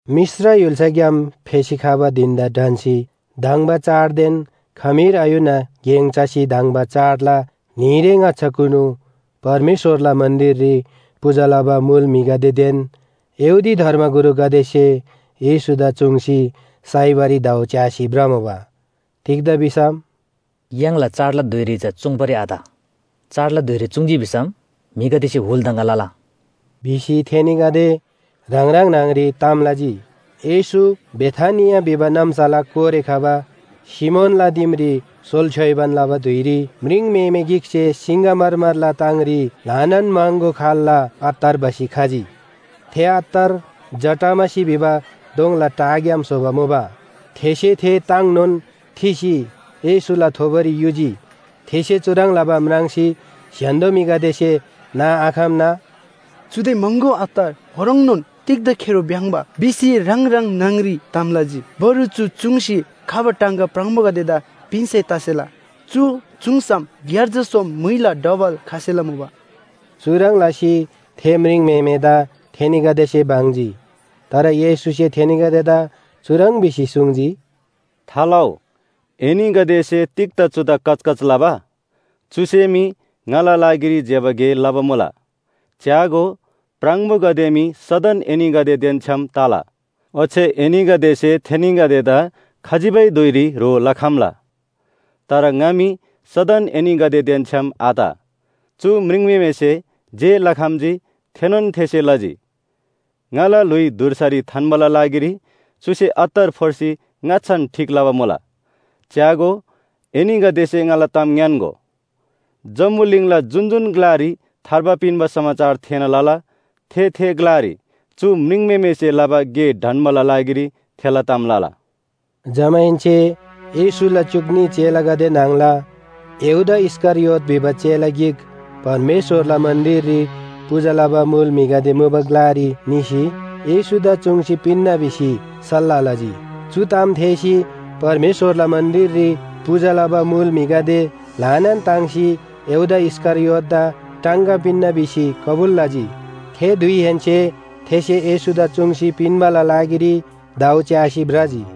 मिश्र य्‍हुल्‍साग्‍याम फेसी खबा धिन‍दा ढन्‍सी धङ्बा चाङदेन खमीर आयुना गेङ चसी धङ्बा चाडला न्‍हीरे ङाच्‍छाकुनु परमेश्‍वरला मन्‍दिररी पूजा लबा मुल म्‍हिगदेदेन यहूदी धर्मगुरुगदेसे येशूदा चुङ्सी साइबारी दाउ च्‍यासी भ्रमुबा। तिग्‍दा भिसम “य्‍हाङला चाडला धुइरी चा चुङ्बारी आत। चाडला धुइरी चुङ्‌जी भिसम म्‍हिगदेसे हुल दङगा लला” भिसी थेनीगदे ह्राङ ह्राङ न्‍हङरी ताम लजी। येशू बेथानिया भिबा नाम्‍साला कोरे खबा सिमोनला दिमरी सोल छ्‌योइबान लबा धुइरी म्रिङम्‍हेमे गिकसे सिङ्‍गमरमरला ताङरी ल्‍हानान महँगो खाल्‍ला अत्तर भसी खजी। थे अत्तर जटामसी भिबा दोङला टाग्‍याम स्‍होबा मुबा। थेसे थे ताङनोन थिसी येशूला थोबोरी युजी। थेसे चुह्रङ् लबा म्राङ्सी स्‍य्‍हान्‍दो म्‍हिगदेसे नाआखम्‍ना “चुदे महँगो अत्तर ओह्रङ्नोन तिग्‍दा खेरो भ्‍याङ्‍बा” भिसी ह्राङ ह्राङ न्‍हङरी ताम लजी। बरु चु चूङ्सी खबा टाङगा प्राङबोगदेदा पिन्‍सै तसेला। चु चूङ्सम ग्‍यार्जा सोम म्‍हुइला डबल खसेला मुबा” चुह्रङ् लसी थे म्रिङम्‍हेमेदा थेनीगदेसे बङ्जी। तर येशूसे थेनीगदेदा चुह्रङ् भिसी सुङ्जी, “थालउ, एनीगदेसे तिग्‍दा चुदा कचकच लबा? चुसे मी ङाला लागिरी ज्‍यबा गे लबा मुला। च्‍यागो, प्राङबोगदे मी सदन एनीगदेदेन छ्‌याम तला। ओच्‍छे एनीगदेसे थेनीगदेदा खजिबै धुइरी ह्रो लखम्‍ला। तर ङा मी सदन एनीगदेदेन छ्‌याम आत। चु म्रिङम्‍हेमेसे जे लखम्‍जी, थेनोन थेसे लजी। ङाला ल्‍हुइ धुर्सारी थान्‍बाला लागिरी चुसे अत्तर फोर्सी ङाच्‍छान ठीक लबा मुला। च्‍यागो, एनीगदेसे ङाला ताम ङ्‌यान्‍गो, जम्‍बुलिङला जुन जुन ग्‍लारी थार्बा पिन्‍बा समाचार थेःना लला, थे, थे ग्‍लारी चु म्रिङम्‍हेमेसे लबा गे ढन्‍बाला लागिरी थेला ताम लला।” जमाहेन्‍से येशूला च्‍युक न्‍ही चेलागदे न्‍हङला यहूदा इस्‍करियोत भिबा चेला गिक परमेश्‍वरला मन्‍दिररी पूजा लबा मुल म्‍हिगदे मुबा ग्‍लारी निसी येशूदा चुङ्सी पिन्‍ना भिसी सल्‍लाह लजी। चु ताम थेःसी परमेश्‍वरला मन्‍दिररी पूजा लबा मुल म्‍हिगदे ल्‍हानान ताङ्सी यहूदा इस्‍करियोतदा टाङगा पिन्‍ना भिसी कबुल लजी। थे धुइहेन्‍से थेसे येशूदा चुङ्सी पिन्‍बाला लागिरी दाउ च्‍यासी भ्रजी।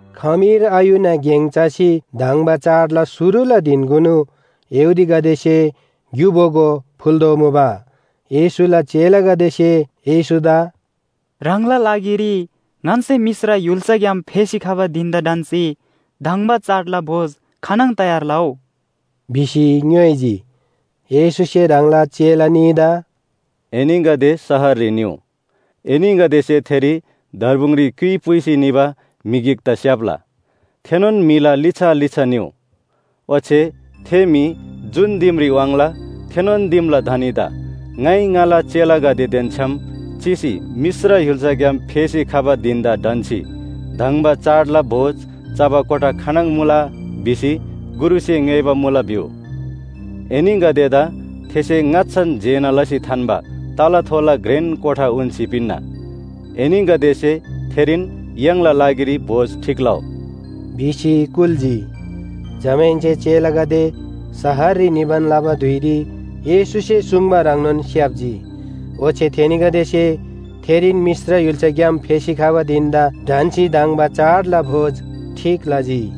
खमीर आयुना गेङ चसी धङ्बा चाडला शुरुला धिनकुनु यहूदीगदेसे ग्‍यु बोगो फुल्‍तोःमुबा। येशूला चेलागदेसे येशूदा “ह्राङला लागिरी ङन्‍से मिश्र य्‍हुल्‍साग्‍याम फेसी खबा धिन‍दा ढन्‍सी धङ्बा चाडला भोज खानङ ठीक लउ?” भिसी ङ्‌योइजी। येशूसे ह्राङला चेला न्‍हीदा “एनीगदे शहररी निउ, एनीगदेसे थेरी दर्बुङरी क्‍युइ पुइसी निबा म्‍हि गिकदा स्‍याप्‍ला। थेनोन म्‍हिला लिच्‍छा लिच्‍छा निउ। ओच्‍छे थे म्‍हि जुन दिमरी वाङ्ला, थेनोन दिमला धनीदा ‘ङाइ ङाला चेलागदेदेन छ्‌याम चिसी मिश्र य्‍हुल्‍साग्‍याम फेसी खबा धिन‍दा ढन्‍सी धङ्बा चाडला भोज चबा कोठा खानङ मुला?’ भिसी गुरुसे ङ्‌योइबा मुला भिउ। एनीगदेदा थेसे ङाच्‍छान जेना लसी थान्‍बा तलाथोला घ्रेन कोठा उन्‍सी पिन्‍ना। एनीगदेसे थेरीन य्‍हाङला लागिरी भोज ठीक लउ” भिसी कुल्‍जी। जमाहेन्‍से चेलागदे शहररी निबान लबा धुइरी येशूसे सुङ्बा ह्रङ्नोन स्‍याप्‍जी। ओच्‍छे थेनीगदेसे थेरीन मिश्र य्‍हुल्‍साग्‍याम फेसी खबा धिन‍दा ढन्‍सी धङ्बा चाडला भोज ठीक लजी।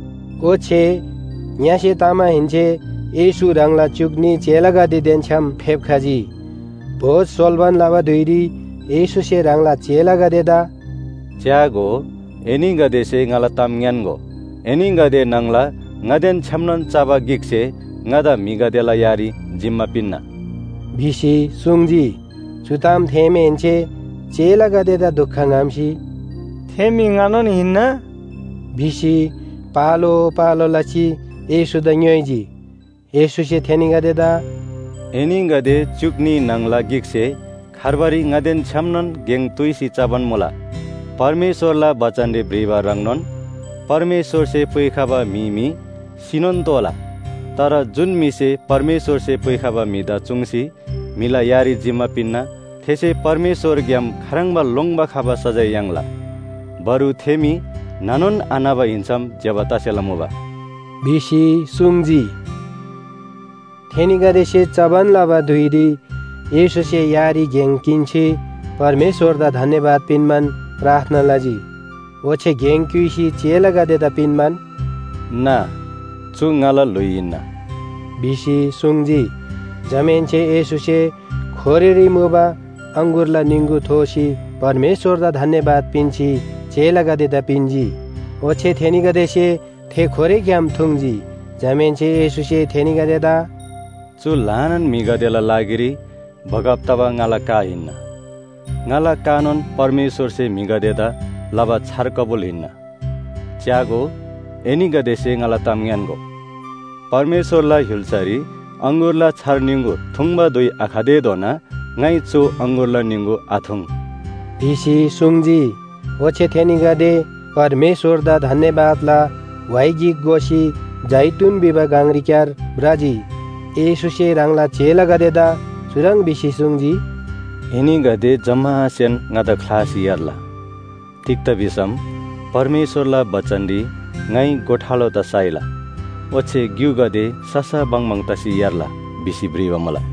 ओच्‍छे ङ्‍यसे तमाहेन्‍से येशू ह्राङला च्‍युक न्‍ही चेलागदेदेन छ्‌याम फेप्‍खजी। भोज सोल्‍बान लबा धुइरी येशूसे ह्राङला चेलागदेदा “च्‍यागो, एनीगदेसे ङाला ताम ङ्‌यान्‍गो, एनीगदे न्‍हङला ङादेन छ्‌यामनोन चबा गिकसे ङादा म्‍हिगदेला यारी जिम्‍मा पिन्‍ना” भिसी सुङ्जी। चु ताम थेःमाहेन्‍से चेलागदेदा दुख ङ्‍हम्‍सी, “थे म्‍हि ङानोन हिन्‍ना?” भिसी पालो पालो लसी येशूदा ङ्‌योइजी। येशूसे थेनीगदेदा “एनीगदे च्‍युक न्‍ही न्‍हङला गिकसे खार्बारी ङादेन छ्‌यामनोन गेङ तुइसी चबान मुला। परमेश्‍वरला बचनरी भ्रिबा ह्रङ्नोन परमेश्‍वरसे पुइखबा म्‍हि मी सिनोन तोःला। तर जुन म्‍हिसे परमेश्‍वरसे पुइखबा म्‍हिदा चुङ्सी म्‍हिला यारी जिम्‍मा पिन्‍ना, थेसे परमेश्‍वरग्‍याम खाह्रङ्बा लोङ्‌बा खबा सजाय याङ्ला। बरु थे मी न्‍हनोन आन्‍हबा हिन्‍सम ज्‍यबा तसेला मुबा” भिसी सुङ्जी। थेनीगदेसे चबान लबा धुइरी येशूसे यारी गेङ किन्‍सी परमेश्‍वरदा धन्‍यवाद पिन्‍बान प्रार्थना लजी। ओच्‍छे गेङ क्‍युइसी चेलागदेदा पिन्‍बान, “ना! चु ङाला ल्‍हुइ हिन्‍ना” भिसी सुङ्जी। जमाहेन्‍से येशूसे खोरेरी मुबा अङगुरला निङगु थोसी परमेश्‍वरदा धन्‍यवाद पिन्‍सी चेलागदेदा पिन्‍जी। ओच्‍छे थेनीगदेसे थे खोरेग्‍याम थुङ्‌जी। जमाहेन्‍से येशूसे थेनीगदेदा “चु ल्‍हानान म्‍हिगदेला लागिरी बगब तबा ङाला का हिन्‍ना। ङाला कानोन परमेश्‍वरसे म्‍हिगदेदा लबा छार कबुल हिन्‍ना। ‘च्‍यागो, एनीगदेसे ङाला ताम ङ्‌यान्‍गो, परमेश्‍वरला य्‍हुल्‍सारी अङगुरला छार निङगु थुङ्बा धुइ आखतेधोना ङाइ चु अङगुरला निङगु आथुङ्’ भिसी सुङ्जी।” ओच्‍छे थेनीगदे परमेश्‍वरदा धन्‍यवादला व्‍हाइ गिक गोसी जैतून भिबा गङरीक्‍यार भ्रजी। येशूसे ह्राङला चेलागदेदा चुह्रङ् भिसी सुङ्जी, “एनीगदे जम्‍मासेन ङादा ख्‍लासी यार्ला। तिग्‍दा भिसम परमेश्‍वरला बचनरी ‘ङाइ गोठालोदा साइला ओच्‍छे ग्‍युगदे ससा बङबङ तसी यार्ला’ भिसी भ्रिबा मुला।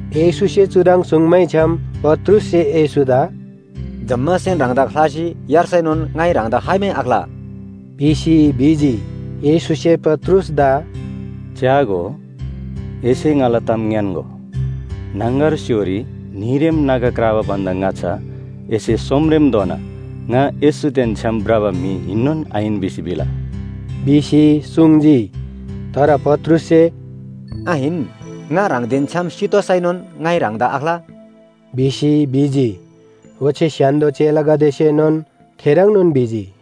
येशूसे चुह्रङ् सुङ्मैछ्‌याम पत्रुससे येशूदा “जम्‍मासेन ह्राङदा ख्‍लासी यार्सैनोन ङाइ ह्राङदा खाइमै आख्‍ला” भिसी भिजी। येशूसे पत्रुसदा “च्‍यागो, एसे ङाला ताम ङ्‌यान्‍गो, न्‍हङगर स्‍य्‍होरी न्‍हीरेम नागा क्राबा भन्‍दा ङाच्‍छा एसे सोमरेमधोना ङा येशूदेन छ्‌याम भ्रबा म्‍हि हिन्‍नोन आहिन भिसी भिला” भिसी सुङ्जी। तर पत्रुससे, “आहिन, ङा ह्राङदेन छ्‌याम सितोःसैनोन ङाइ ह्राङदा आख्‍ला” भिसी भिजी। ओच्‍छे स्‍य्‍हान्‍दो चेलागदेसेनोन थेह्रङ्नोन भिजी।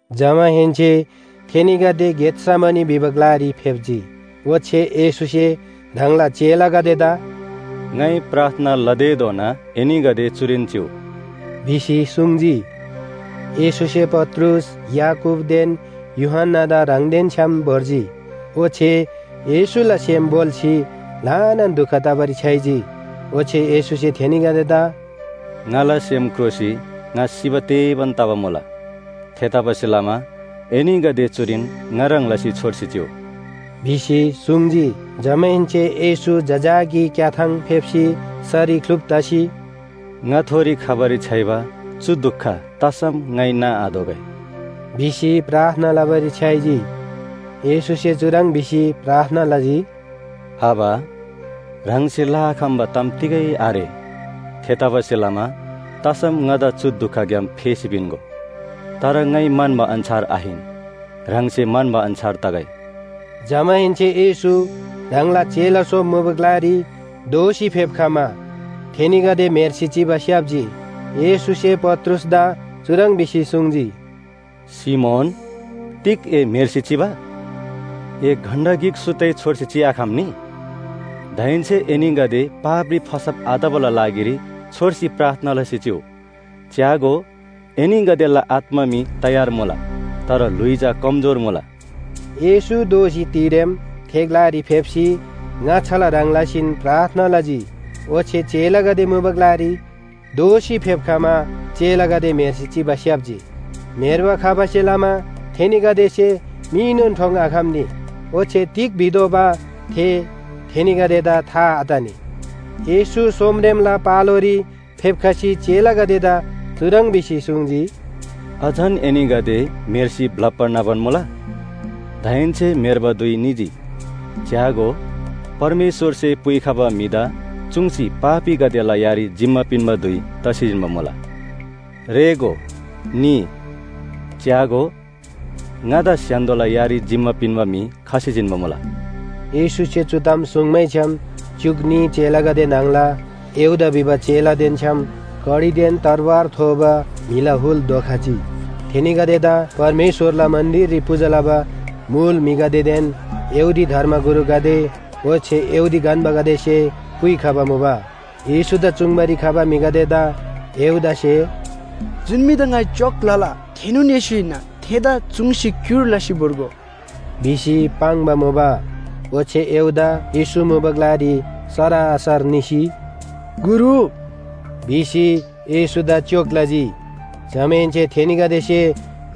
जमाहेन्‍से थेनीगदे गेत‍समनी भिबा ग्‍लारी फेप्‍जी। ओच्‍छे येशूसे ह्राङला चेलागदेदा “ङाइ प्रार्थना लतेधोना एनीगदे चुरीन चिउ” भिसी सुङ्जी। येशूसे पत्रुस, याकूबदेन यूहन्‍नादा ह्राङदेन छ्‌याम भोर्जी। ओच्‍छे येशूला सेम भोल्‍सी ल्‍हानान दुख तबारी छ्‌याइजी। ओच्‍छे येशूसे थेनीगदेदा “ङाला सेम क्रोसी ङा सिबा तेबान तबा मुला। थेतबासेलमा एनीगदे चुरीन ङा ह्रङ् लसी छोर्सी चिउ” भिसी सुङ्जी। जमाहेन्‍से येशू जजाकी क्‍याथाङ फेप्‍सी सरी ख्‍लुप तसी, “ङाथोरी खबारी छ्‌याइबा चु दुख तसम ङाइ नाआतोःगै” भिसी प्रार्थना लबारी छ्‌याइजी। येशूसे चुह्रङ् भिसी प्रार्थना लजी, “आबा, ह्राङसे लआखम्‍बा ताम तिगै आरे, थेतबासेलमा तसम ङादा चु दुखग्‍याम फेसी पिन्‍गो। तर ङाइ म्‍हन्‍बा अन्‍छार आहिन, ह्राङसे म्‍हन्‍बा अन्‍छार तगै।” जमाहेन्‍से येशू ह्राङला चेला सोम मुबा ग्‍लारी दोःसी फेप्‍खमा थेनीगदे म्‍हेर्सी चिबा स्‍याप्‍जी। येशूसे पत्रुसदा चुह्रङ् भिसी सुङ्जी, “सिमोन, तिग ए म्‍हेर्सी चिबा? ए घण्‍टा गिक सुत्तै छोर्सी चिआखम्‍नी? दाहेन्‍से एनीगदे पापरी फसब आतबाला लागिरी छोर्सी प्रार्थना लसी चिउ। च्‍यागो, एनीगदेला आत्‍मा मी तयार मुला, तर ल्‍हुइ चा कमजोर मुला।” येशू दोःसी तिरेम थे ग्‍लारी फेप्‍सी ङाच्‍छाला ह्रङ् लसीन प्रार्थना लजी। ओच्‍छे चेलागदे मुबा ग्‍लारी दोःसी फेप्‍खमा चेलागदे म्‍हेर्सी चिबा स्‍याप्‍जी। म्‍हेर्बा खबासे लमा थेनीगदेसे मीनोन ठोङ्आखम्‍नी, ओच्‍छे तिग भितोःबा थे थेनीगदेदा था आतनी। येशू सोमरेमला पालोरी फेप्‍खसी चेलागदेदा चुह्रङ् भिसी सुङ्जी, “अझन एनीगदे म्‍हेर्सी ब्‍लप्‍बा न्‍हबान मुला? दाहेन्‍से म्‍हेर्बा धुइ निजी। च्‍यागो, परमेश्‍वरसे पुइखबा म्‍हिदा चुङ्सी पापीगदेला यारी जिम्‍मा पिन्‍बा धुइ तसी जिन्‍बा मुला। रेःगो, निइ! च्‍यागो, ङादा स्‍य्‍हान्‍दोला यारी जिम्‍मा पिन्‍बा म्‍हि खसी जिन्‍बा मुला।” येशूसे चु ताम सुङ्मैछ्‌याम च्‍युक न्‍ही चेलागदे न्‍हङला यहूदा भिबा चेलादेन छ्‌याम कडीदेन तरवार थोबा म्‍हिला हुल धोखजी। थेनीगदेदा परमेश्‍वरला मन्‍दिररी पूजा लबा मुल म्‍हिगदेदेन यहूदी धर्मगुरुगदे ओच्‍छे यहूदी गन्‍बागदेसे पुइखबा मुबा। येशूदा चुङ्बारी खबा म्‍हिगदेदा यहूदासे “जुन म्‍हिदा ङाइ च्‍योक लला, थेनोन येशू हिन्‍ना, थेदा चुङ्सी क्‍युर लसी भोर्गो” भिसी पाङ्बा मुबा। ओच्‍छे यहूदा येशू मुबा ग्‍लारी सरासर निसी, “गुरु” भिसी येशूदा च्‍योक लजी। जमाहेन्‍से थेनीगदेसे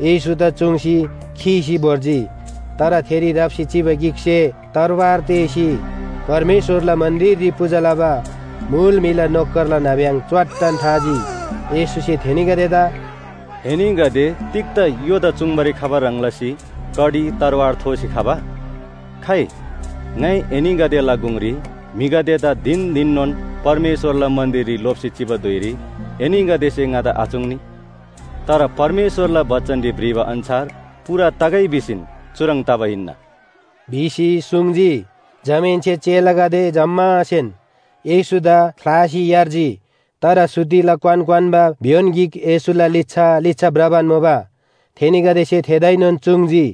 येशूदा चुङ्सी खीसी भोर्जी। तर थेरी राप्‍सी चिबा गिकसे तरवार तेःसी परमेश्‍वरला मन्‍दिररी पूजा लबा मुल म्‍हिला नोकरला नाब्‍यङ च्‍वाट्टन थाजी। येशूसे थेनीगदेदा “एनीगदे तिग्‍दा य्‍होदा चुङ्बारी खबा ह्रङ् लसी कडी तरवार थोसी खबा? खाइ, ङाइ एनीगदेला गुङरी म्‍हिगदेदा धिन धिननोन परमेश्‍वरला मन्‍दिररी लोप्‍सी चिबा धुइरी एनीगदेसे ङादा आचुङ्नी। तर परमेश्‍वरला बचनरी भ्रिबा अन्‍छार पूरा तगै भिसीन चुह्रङ् तबा हिन्‍ना” भिसी सुङ्जी। जमाहेन्‍से चेलागदे जम्‍मासेन येशूदा ख्‍लासी यार्जी। तर सुतिला क्‍वान क्‍वान्‍बा भ्‍योन गिक येशूला लिच्‍छा लिच्‍छा भ्रबान मुबा। थेनीगदेसे थेदाएनोन चुङ्‌जी।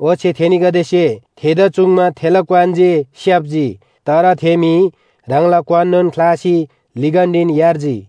ओच्‍छे थेनीगदेसे थेदा चुङ्मा थेला क्‍वान जे स्‍याप्‍जी। तर थे म्‍हि ह्राङला क्‍वाननोन ख्‍लासी लिगन्‍डीन यार्जी।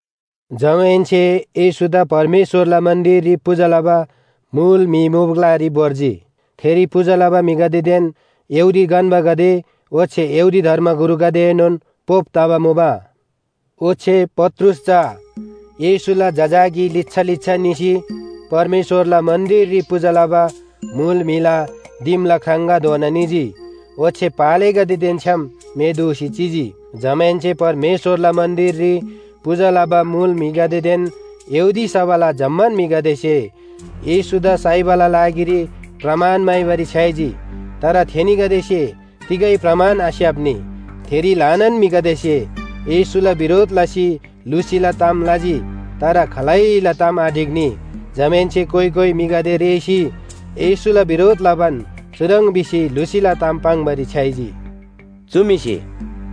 जमाहेन्‍से येशूदा परमेश्‍वरला मन्‍दिररी पूजा लबा मुल म्‍हि मुबा ग्‍लारी भोर्जी। थेरी पूजा लबा म्‍हिगदेदेन यहूदी गन्‍बागदे ओच्‍छे यहूदी धर्मगुरुगदेएनोन पोप तबा मुबा। ओच्‍छे पत्रुस चा येशूला जजाकी लिच्‍छा लिच्‍छा निसी परमेश्‍वरला मन्‍दिररी पूजा लबा मुल म्‍हिला दिमला ख्राङगाधोना निजी, ओच्‍छे पालेगदेदेन छ्‌याम मे दूसी चिजी। जमाहेन्‍से परमेश्‍वरला मन्‍दिररी पूजा लबा मुल म्‍हिगदेदेन यहूदी सभाला जम्‍मान म्‍हिगदेसे येशूदा साइबाला लागिरी प्रमाण म्‍हाइबारी छ्‌याइजी। तर थेनीगदेसे तिगै प्रमाण आस्‍याप्‍नी। थेरी ल्‍हानान म्‍हिगदेसे येशूला बिरोध लसी लुसीला ताम लजी। तर खालैला ताम आढिक्‍नी। जमाहेन्‍से कोइ कोइ म्‍हिगदे रेःसी येशूला बिरोध लबान चुह्रङ् भिसी लुसीला ताम पाङ्‌बारी छ्‌याइजी, “चु म्‍हिसे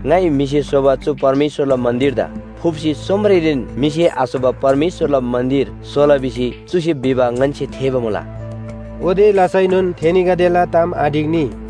‘ङाइ म्‍हिसे स्‍होबा चु परमेश्‍वरला मन्‍दिरदा फुप्‍सी सोमरेरीन म्‍हिसे आस्‍होबा परमेश्‍वरला मन्‍दिर स्‍होला भिसी चुसे भिबा ङन्‍से थेःबा मुला।’” ओते लसैनोन थेनीगदेला ताम आढिक्‍नी।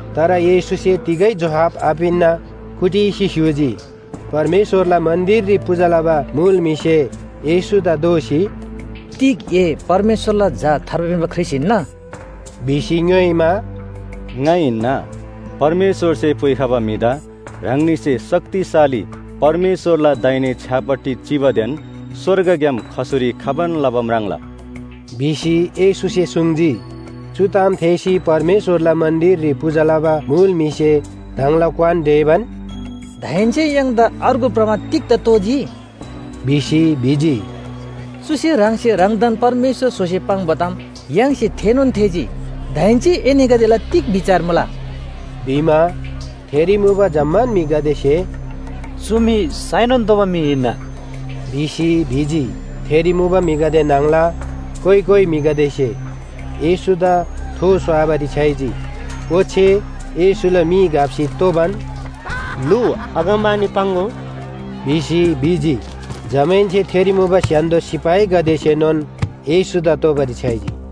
तर येशूसे तिगै जोहाब आपिन्‍ना कुटिसी स्‍य्‍हूजी। परमेश्‍वरला मन्‍दिररी पूजा लबा मुल म्‍हिसे येशूदा दोःसी, “तिग ए परमेश्‍वरला झा थार्बा पिन्‍बा ख्रीष्‍ट हिन्‍ना?” भिसी ङ्‌योइमा, “ङा हिन्‍ना, परमेश्‍वरसे पुइखबा म्‍हिदा ह्राङनीसे शक्तिशाली परमेश्‍वरला दाहिने छ्‌यापट्टि चिबादेन स्‍वर्गग्‍याम खसुरी खबान लबा म्राङ्ला” भिसी येशूसे सुङ्जी। चु ताम थेःसी परमेश्‍वरला मन्‍दिररी पूजा लबा मुल म्‍हिसे ह्राङला क्‍वान ढेबान, “दाहेन्‍से य्‍हाङदा अर्गु प्रमाण तिग्‍दा तोःजी?” भिसी भिजी। “चुसे ह्राङसे ह्राङदान परमेश्‍वर स्‍होसी पाङ्बा ताम य्‍हाङसे थेःनोन थेःजी, दाहेन्‍से एनीगदेला तिग बिचार मुला?” भिमा, थेरी मुबा जम्‍मान म्‍हिगदेसे “चु म्‍हि साइनोन तोःबा म्‍हि हिन्‍ना” भिसी भिजी। थेरी मुबा म्‍हिगदे न्‍हङला कोइ कोइ म्‍हिगदेसे येशूदा थो स्‍वाबारी छ्‌याइजी। ओच्‍छे येशूला मी घप्‍सी तोबान, “लु, अगमवाणी पाङ्‍गो” भिसी ङ्‌योइजी। जमाहेन्‍से थेरी मुबा स्‍य्‍हान्‍दो सिपाहीगदेसेनोन येशूदा तोबारी छ्‌याइजी।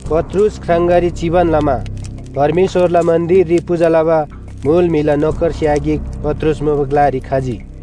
पत्रुस ख्राङगारी चिबान लमा परमेश्‍वरला मन्‍दिररी पूजा लबा मुल म्‍हिला नोकरस्‍या गिक पत्रुस मुबा ग्‍लारी खजी।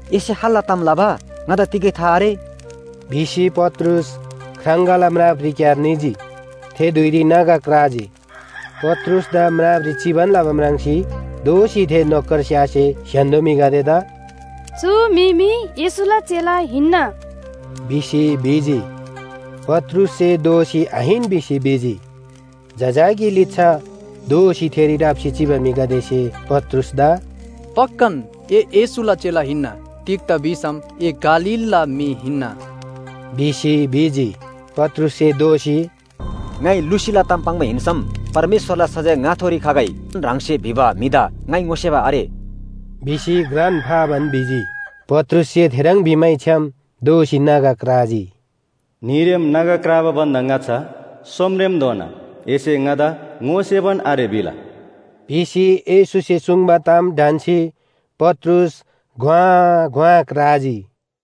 “एसे खाल्‍ला ताम लबा, ङादा तिगै था आरे” भिसी पत्रुस ख्राङगाला म्रापरीक्‍यार निजी। थे धुइरी नागा क्राजी। पत्रुसदा म्रापरी चिबान लबा म्राङ्सी दोःसी थे नोकरस्‍यासे स्‍य्‍हान्‍दो म्‍हिगदेदा “चु म्‍हि मी येशूला चेला हिन्‍ना” भिसी भिजी। पत्रुससे दोःसी आहिन भिसी भिजी। जजाकी लिच्‍छा दोःसी थेरी राप्‍सी चिबा म्‍हिगदेसे पत्रुसदा “पक्‍कान, ए येशूला चेला हिन्‍ना। तिग्‍दा भिसम ए गालीलला म्‍हि हिन्‍ना” भिसी भिजी। पत्रुससे दोःसी, “ङाइ लुसीला ताम पाङ्बा हिन्‍सम परमेश्‍वरला सजाय ङाथोरी खइ भिसी घ्रान फाबान ह्राङसे भिबा म्‍हिदा ङाइ ङोसेबा आरे” भिसी भिजी। पत्रुससे थेह्रङ् भिमैछ्‌याम दोःसी नागा क्राजी। “न्‍हीरेम नागा क्राबा भन्‍दा ङाच्‍छा सोमरेमधोना एसे ङादा ङोसेबान आरे भिला” भिसी येशूसे सुङ्बा ताम ढन्‍सी पत्रुस घ्‍वाँ घ्‍वाँ क्राजी।